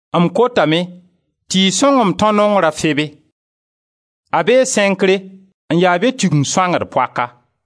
M kotame tɩ y sõng m tão nongr a Febe; a bee Sẽnkre, n ya be Tigeng sõangd poaka.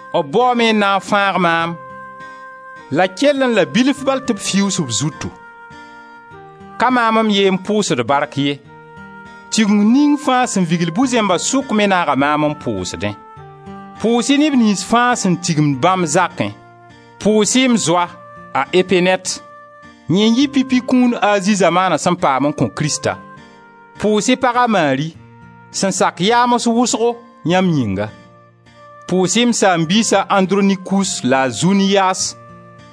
B baoome n na n fãag maam la kellẽ la bilf bal tɩ b fiuus b zutu. Ka maam m ye n pʋʋsd bark ye, Tigeng ning fãa sẽn vigl bu-zẽmba sʋka me naaga maam n pʋʋsdẽ. Pʋʋs-y neb niyns fãa sẽn tigimd bãmb zakẽ. Pʋʋs-y m zoa a Epenɛt: yẽ n yɩ pipi kũun Azi zamaana sẽn paam n kõ Krista. Pʋʋs-y pag a Mari, sẽn sak yaams wʋsgo yãmb yĩnga. Pʋʋs-y m saam-biis a Andronikus la a Zuniyas,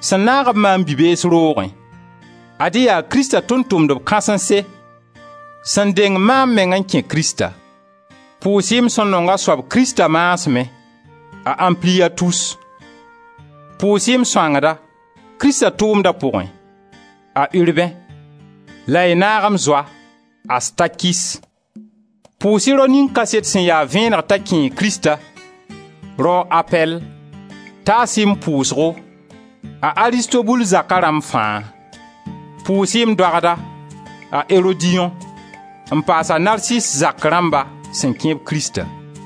sẽn naag-b maam bi-bees roogẽ, Ad-y yaa Krista tʋʋm-tʋmdb kãsense sẽn deng maam meng n kẽ Krista. Pʋʋs-y m sẽn nong a soab Krista maasmẽ, a Ampliyatus. Pʋʋs-y m sõangda, Krista tʋʋmda pʋgẽ, a Urbẽ la y naag m zoa a Stakis. Pʋʋs-y rao ning kaset sẽn ya vẽeneg t'a kẽe Krista, rao a Apɛll. Taas-y m pʋʋsgo a Aristobul zaka rãmb fãa. Pʋʋs-y m doagda, a Erodiyõ, n paas a Narsis zak rãmba sẽn kẽ-b Krista.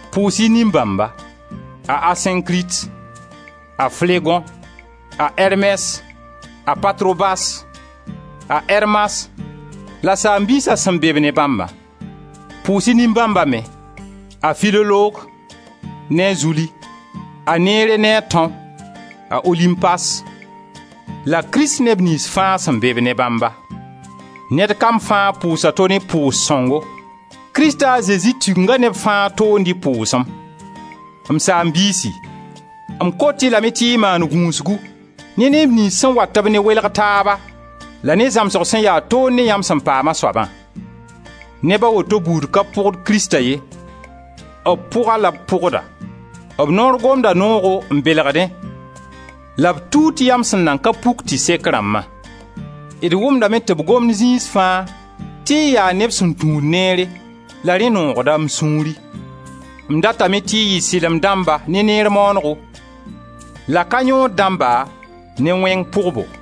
Pʋʋs-y nin-bãmba: a Asẽnkrit, a Flegõ, a Ermɛs, a Patrobas, a Ermas la saam-biisa sẽn be-b ne bãmba. Pʋʋs-y nin-bãmba me: a Filolog ne a Zuli, a Nere ne a tão, a Olimpas la Krist neb niyns fãa sẽn be-b ne bãmba. Ned kam fãa pʋʋs a to ne pʋʋs sõngo. Krista a Zezi Tigenga neb fãa toond-y pʋʋsem. M saam-biisi, m kot-y lame tɩ y maan gũusgu ne neb niyns sẽn wat-b ne welg taaba la ne zãmsg sẽn ya toor ne yãmb sẽn paam a soabã. Neba woto buud ka pʋgd Krista ye, b pʋga la b pʋgda. B noor gomda noogo n belgdẽ la b tuut yam sẽn nan ka puk tɩ sek rãmbã. D wʋmdame tɩ b gomd zĩis fãa tɩ y yaa neb sẽn tũud neere la rẽ noogda m sũuri: m datame tɩ y yɩ sɩlem dãmba ne neer maanego la ka yõod dãmba ne wẽng pʋgbo.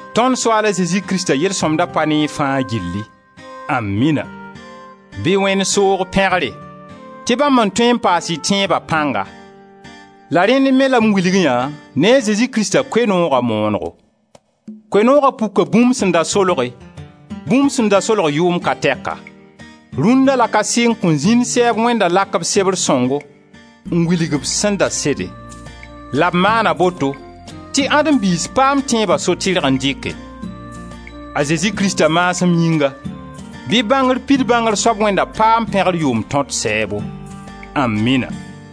Tõnd Soaal a Zezi Krista yel-sõmda pa ne y fãa gilli. Amina!] Bɩ Wẽnd soog pẽgre tɩ bãmb n tõe n paas y tẽeba pãnga. La rẽnd me la m wilg yã ne a Zesi Krista Koe-nooga moonego. Koe-nooga puka bũmb sẽn da solge, bũmb sẽn da solg yʋʋm ka tɛka. Rũnna la ka sɩng kõn zĩnd sɛɛb Wẽnda lak b Sebr sõngo n wilg b sẽn da sede; la b maana boto tɩ Adem biis paam tẽeba so-tɩrg n dɩke. A Zezi Krista maasem yĩnga, bɩ bãngr pid bãngr soab Wẽnda paam pẽgr yʋʋm tõt sɛɛbo! Amina!